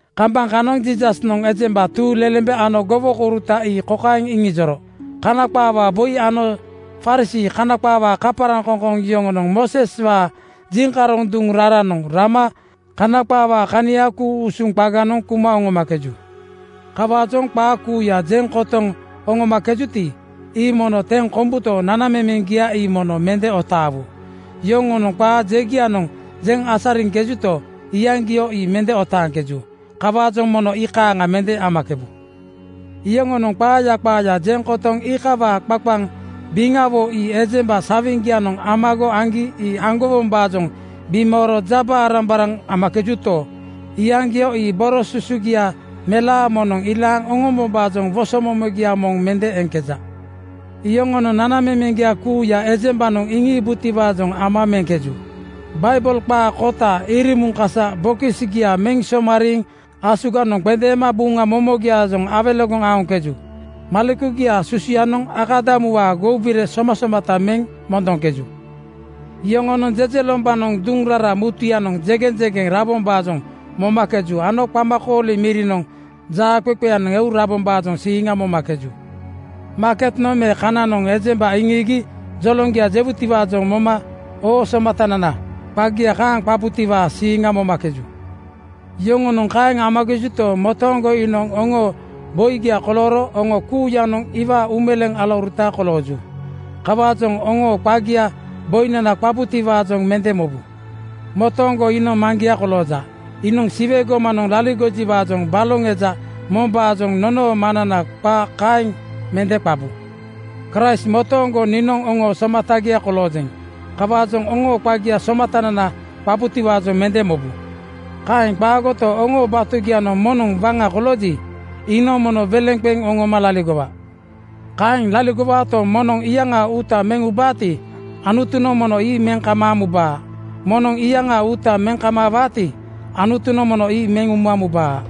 Kambaŋ kanoŋ Jiisasnoŋ ejemba tuuŋlelembe ano gowokouruta ii kokaeŋ iŋijoro, “Kana qaawaa boi ano Farisii (Kana qaawaa kaparaŋkoŋkoŋ) yoŋonoŋ Mooseswaa jiŋkaroŋ duŋ raranoŋ rama Kana qaawaa kania ku-usuŋ qaganoŋ kuma oŋomakeju. Kawaajoŋ qaa kuuya jeŋ kotoŋ oŋomakejuti, ii mono teŋ kombuto, nanamemeŋgia ii mono mende otaawu. Yoŋonoŋ qaa jegianoŋ jeŋ asariŋkejuto, iyaŋgio ii mende otaaŋkeju. Kawaajoŋ mono ii kaaŋa mende amakebu. “Yoŋonoŋ qaaya qaaya jeŋ kotoŋ iikawaa qaqaŋ biŋawo ii ejemba sawiŋgianoŋ amago aŋgi ii aŋgowombaajoŋ bimooro jarambaraŋ amakejuto, iyaŋgio ii boro susugia melaa moŋnoŋ ilaaŋ oŋombombaajoŋ wosomomogia moŋ mende eŋkeja. “Yoŋonoŋ nanamemeŋgia kuuya ejembanoŋ iŋiibutiwaajoŋ ama meŋkeju. Baibel qaa kota (memori jawo) irimuŋ kasa bokisgia meŋ somariiŋ asuganoŋ qendeema Buŋa momogiaajoŋ awelegoŋ aoŋkeju. Malekugiaa susuyanoŋ akadamuwaa goubire somasomata meŋ mondoŋkeju. Yoŋonoŋ jejelombanoŋ duŋ rara mutuyanoŋ jegeŋjegeŋ rabombaajoŋ momakeju ano qamakooli mirinoŋ jaaqeqeyanoŋ eu rabombaajoŋ siiŋa momakeju. Maaketnoŋ me kananoŋ ejemba iŋiigi joloŋgia jewutiwaajoŋ moma ‘Oo somatanana,’ qagia kaaŋ qabutiwaa siiŋa momakeju. “Yoŋonoŋ kaeŋ amakejuto, motooŋgo iinoŋ oŋoo Boigia kolooro oŋo kuuyanoŋ iwaa uumeleeŋ alauruta kolooju. Kawaajoŋ oŋoo qagia boinana qabutiwaajoŋ mende mobu. Motooŋgo iinoŋ Maŋgia kolooja. Iinoŋ Siwe gomanoŋ laligojiwaajoŋ baloŋ eja mombaajoŋ nonoo Maŋnana qa kaeŋ mende qabu. Kraist motooŋgo niinoŋ oŋoo somatagia koloojeŋ. Kawaajoŋ oŋoo qagia ‘Somatanana,’ qabutiwaajoŋ mende mobu. “Kaeŋ qaagoto, oŋoo batugianoŋ moŋnoŋ waŋa kolooji, iinoŋ mono weleŋ qeŋ oŋoma laligowa. Kaeŋ laligowaato, moŋnoŋ iyaŋaa uuta meŋ ubaati, Anutunoŋ mono ii meŋ kamaaŋ mubaa. Moŋnoŋ iyaŋaa uuta meŋ kamaawaati, Anutunoŋ mono ii meŋ uma mubaa.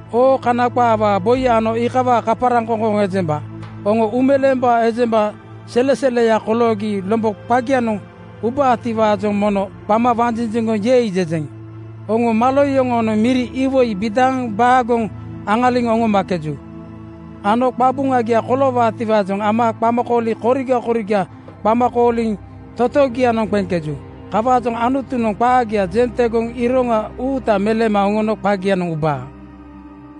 Oo Kana qaawaa boi ano iikawaa kaparaŋkoŋkoŋ ejemba! Oŋo uumeleembaa ejemba seleseleya koloogi lombo qagianoŋ ubaatiwaajoŋ mono qama wanjinjiŋgoŋ ‘Yei!’ jejeŋ. Oŋo malo yoŋoonoŋ miri iwoi bidaaŋ baagoŋ aŋaliŋ oŋomakeju ano qabuŋagia koloowaatiwaajoŋ ama qamakooli koriga koriga qama kooliŋ totogianoŋ qeŋkeju. Kawaajoŋ Anutunoŋ qaagia jeŋ tegoŋ iroŋa uuta meleeno oŋoo qagianoŋ ubaa.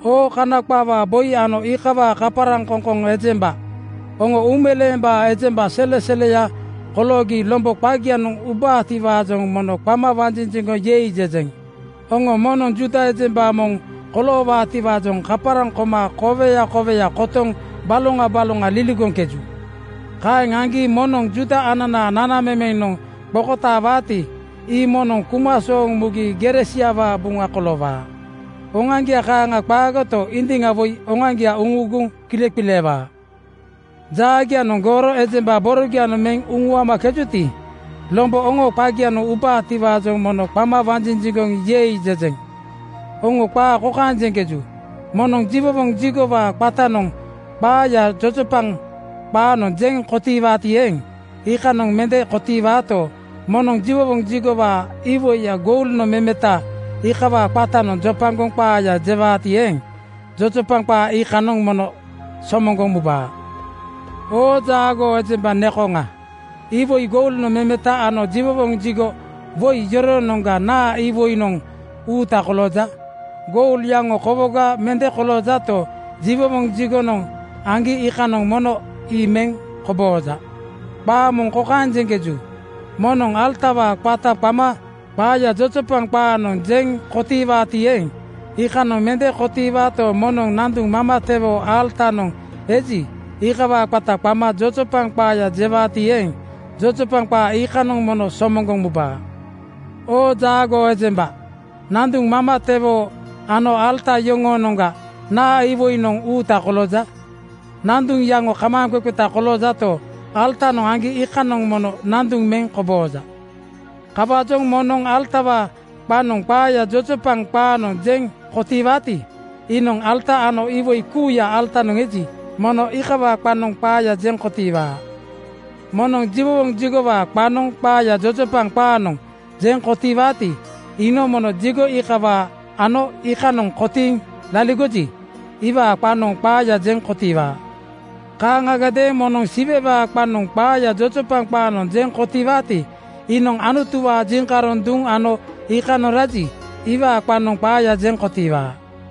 “Oo Kana qaawaa boi ano iikawaa kaparaŋkoŋkoŋ ejemba! Oŋo uumeleembaa ejemba seleseleya koloogi lombo qagianoŋ ubaatiwaajoŋ mono qama wanjinjiŋgoŋ ‘Yei!’ jejeŋ. Oŋo moŋnoŋ Juuda ejemba moŋ koloowaatiwaajoŋ kaparaŋ koma koweya koweya kotoŋ baloŋa baloŋa liligoŋkeju. Kaeŋ aŋgi moŋnoŋ Juuda ananaa nanamemenoŋ qokotaawaati, ii mono kuma sooŋ mugi gere siawaa buŋa koloowaa. Oŋoaŋgia kaaŋa qaagoto, indiŋa woi oŋoaŋgia uŋuuguŋ kileqileewaa. “Jaagianoŋ gooro ejemba borogianoŋ meŋ uŋuamakejuti, lombo oŋoo qagianoŋ ubaatiwaajoŋ mono qama wanjinjiŋgoŋ ‘Yei!’ jejeŋ. Oŋo qaa kokaeŋ jeŋkeju, ‘Moŋnoŋ jiwowoŋ jigowaa qatanoŋ qaaya jojopaŋ qaanoŋ jeŋ kotiiwaati eeŋ, iikanoŋ mende kotiiwaato, moŋnoŋ jiwowoŋ jigowaa iwoi goulnoŋ memeta iikawaa qatanoŋ jojopaŋ qaaya jewaati eeŋ, jojopaŋ qaa iikanoŋ mono somoŋgoŋ mubaa.’ “Oo jaagoo ejemba nekoŋa! Iwoi goulnoŋ memeta ano jiwowoŋ jigo woi yoroonoŋga naa iwoinoŋ uuta kolooja? Goul yaŋo kowoga mende koloojato, jiwowoŋ jigonoŋ aŋgi iikanoŋ mono ii meŋ kobooja. “Qaa moŋ kokaeŋ jeŋkeju, ‘Moŋnoŋ alatawaa qata qama qaaya jojopaŋ qaanoŋ jeŋ kotiiwaati eeŋ, iikanoŋ mende kotiiwaato, moŋnoŋ nanduŋ mamatewoo alatanoŋ eji, iikawaa qata qama jojopaŋ qaaya jewaati eeŋ, jojopaŋ qaa iikanoŋ mono somoŋgoŋ mubaa.’ “Oo jaagoo ejemba! Nanduŋ mamatewoo ano alata yoroonoŋga naa iwoinoŋ uuta kolooja? Nanduŋ yaŋo kamaaŋqeqeta koloojato, alatanoŋ aŋgi iikanoŋ mono nanduŋ meŋ kobooja. Kawaajoŋ moŋnoŋ alatawaa qanoŋ qaaya jojopaŋ qaanoŋ jeŋ kotiiwaati, iinoŋ alata ano iwoi kuuya alatanoŋ eji, mono iikawaa qanoŋ qaaya jeŋ kotiiwaa. “Moŋnoŋ jiwowoŋ jigowaa qanoŋ qaaya jojopaŋ qaanoŋ jeŋ kotiiwaati, iinoŋ mono jigo iikawaa ano iikanoŋ kotiiŋ laligoji, iwaa qanoŋ qaaya jeŋ kotiiwaa. Kaaŋadeeŋ moŋnoŋ Siwewaa qanoŋ qaaya jojopaŋ qaanoŋ jeŋ kotiiwaati, iinoŋ Anutuwaa jiŋkaroŋ duŋ ano iikanoŋ raji, iwaa qanoŋ qaaya jeŋ kotiiwaa.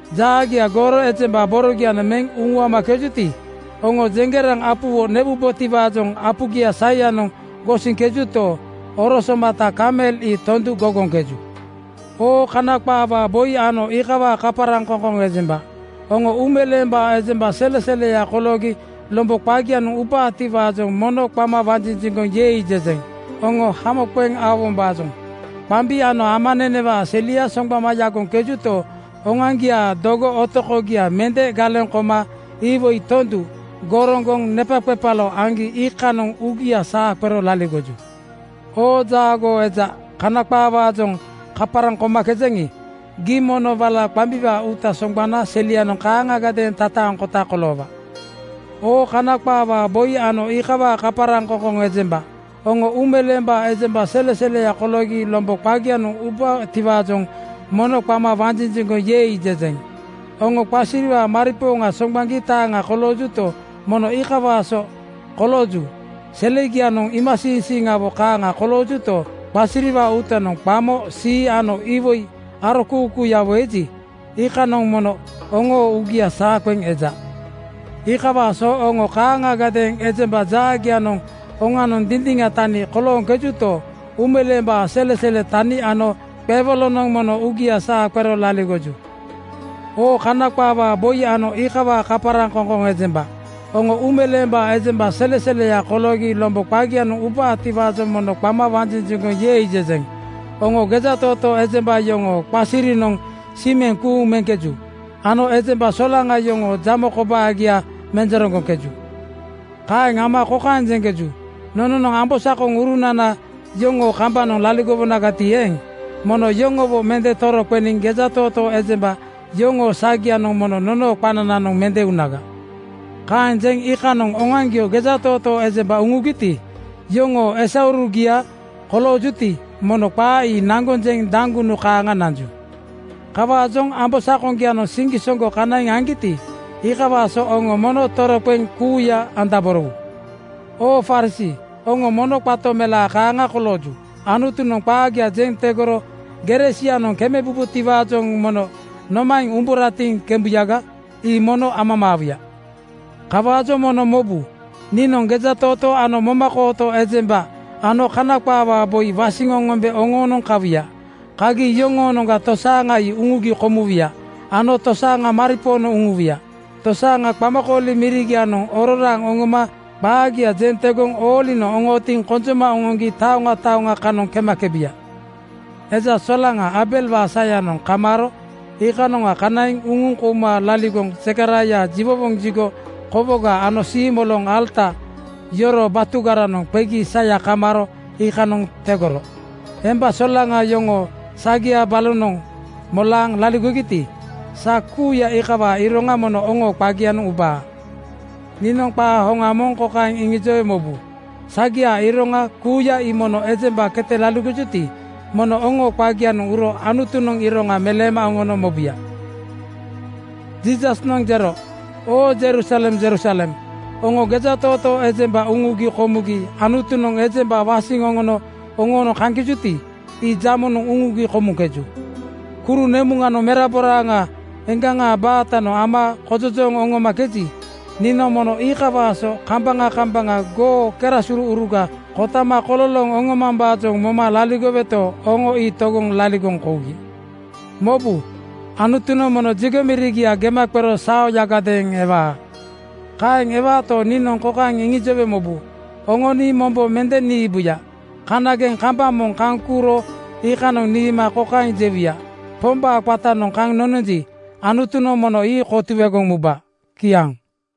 Jaagia gooro ejemba borogianoŋ meŋ uŋuamakejuti, oŋo jeŋgeraŋ apuwo newubotiwaajoŋ apugia saiyanoŋ gosiŋkejuto, oro somata kamel ii tondu gogoŋkeju. Oo Kana qaawaa boi ano iikawaa kaparaŋkoŋkoŋ ejemba! Oŋo uumeleembaa ejemba seleseleya koloogi lombo qagianoŋ ubaatiwaajoŋ mono qama wanjinjiŋgoŋ ‘Yei!’ jejeŋ. Oŋo hamo qeŋ aowombaajoŋ qambi ano amanenewaa selia soŋgbama yagoŋkejuto, oŋoaŋgiaa dogo otokogia mende galeŋ koma iwoi tondu goroŋgoŋ nepaqepalo aŋgi iikanoŋ uugia saa qero laligoju. “Oo jaagoo eja Kana qaawaajoŋ kaparaŋ komakejaŋi, gii mono wala qambiwaa uuta soŋgbana selianoŋ kaaŋagadeeŋ tataaŋkota koloowaa. Oo Kana qaawaa boi ano iikawaa kaparaŋkoŋkoŋ ejemba! Oŋo uumeleembaa ejemba seleseleya koloogi lombo qagianoŋ ubaatiwaajoŋ mono qama wanjinjiŋgoŋ ‘Yei!’ jejeŋ. Oŋo qasiriwaa maripooŋa soŋgbaŋgi taaŋa koloojuti, mono iikawaa so kolooju. Selegianoŋ iimasiiŋsiiŋgiawo kaaŋa koloojuto, qasiriwaa uutanoŋ qamo sii ano iwoi arokuukuuyawo eji, iikaaŋanoŋ mono oŋoo uugia saa qeŋ eja. “Iikawaa so oŋo kaaŋagadeeŋ ejemba jaagianoŋ oŋanoŋ dindiŋa tani kolooŋkejuto, uumeleembaa selesele tani ano qewolonoŋ mono uugia saa qero laligoju. “Oo Kana qaawaa boi ano iikawaa kaparaŋkoŋkoŋ ejemba! Oŋo uumeleembaa ejemba seleseleya koloogi lombo qagianoŋ ubaatiwaajoŋ mono qama wanjinjiŋgoŋ ‘Yei!’ jejeŋ. Oŋo gejatootoo ejemba yoŋoo qasirinoŋ simeŋ kuuŋ meŋkeju ano ejemba solaŋa yoŋoo jamo kobaagia menjereŋgoŋkeju. Kaeŋ ama kokaeŋ jeŋkeju, ‘Nononoŋ ambosakonana yoŋoo kambanoŋ laligowonagati eeŋ, mono yoŋowo mende toroqeniŋ gejatootoo ejemba yoŋoo sagianoŋ mono nonoo qanananoŋ mende unaga.’ “Kaeŋ jeŋ iikanoŋ oŋoaŋgio gejatootoo ejemba uŋugiti, iyoŋoo esaurugia koloojuti, mono qaa ii naŋgoŋ jeŋ daŋgunu kaaŋa nanju. Kawaajoŋ ambosakoŋgianoŋ siŋgisoŋgo kanaiŋ aŋgiti, iikawaa so oŋo mono toroqeŋ kuuya andaborowu. “Oo Farisii, oŋo mono qato melaa kaaŋa kolooju. Anutunoŋ qaagia jeŋ tegoro gere sianoŋ kemebubotiwaajoŋ mono nomaeŋ umburatiŋ kembuyaga? Ii mono amamaawuya. Kawaajoŋ mono mobu, niinoŋ gejatootoo ano momakooto ejemba ano Kana qaawaa boi wasiŋ oŋombe oŋoonoŋ kawuya. Kagi yoŋoonoŋga tosaaŋa ii uŋugi komuwuya ano tosaaŋa maripoonoŋ uŋuwuya. Tosaaŋa qamakooli mirigianoŋ ororaaŋ oŋoma qaagia jeŋ tegoŋ oolinoŋ oŋootiŋ konjoma oŋoŋgi taoŋa taoŋa kanoŋ kemakebuya. “Eja solaŋa Aabelwaa sayanoŋ kamaaro iikanoŋa kanaiŋ uŋuŋ kouma laligoŋ Zekaraia jiwowoŋ jigo kowoga ano siimoloŋ alata yoroo batugaranoŋ qegi saya kamaaro iikanoŋ tegoro. Ejemba solaŋa yoŋoo sagia balonoŋ molaaŋ laligogiti, sa kuuya iikawaa iroŋa mono oŋoo qagianoŋ ubaa. Niinoŋ qaa hoŋa moŋ kokaeŋ iŋijowe mobu: Sagiaa iroŋa kuuya ii mono ejemba kete laligojuti, mono oŋoo qagianoŋ uro Anutunoŋ iroŋa meleema oŋono mobuya.” Jiisasnoŋ jero, “Oo Jerusalem Jerusalem, oŋo gejatootoo ejemba uŋugi komugi Anutunoŋ ejemba wasiŋ oŋono oŋoonoŋ kaŋkejuti, ii jamonoŋ uŋugi komuŋkeju. Kuru nemuŋanoŋ meraboraaŋa eŋgaŋa baatanoŋ ama kojojooŋ oŋomakeji, niinoŋ mono iikawaa so kambaŋa kambaŋa goo kanagesouruga kotama kololooŋ oŋomambaajoŋ moma laligoweto, oŋo ii togoŋ laligoŋ kougi. Mobu, Anutunoŋ mono jigo mirigia gema qero saoyagadeeŋ ewaa. “Kaeŋ ewaato, niinoŋ kokaeŋ iŋijowe mobu, Oŋo nii mombo mende niibuya. Kanageŋ kambaŋ moŋ kaŋ kuuro iikanoŋ niima kokaeŋ jewuya, ‘Pombaa qatanoŋ kaŋ nononji, Anutunoŋ mono ii kotuegoŋ muba.’ Kiaŋ.”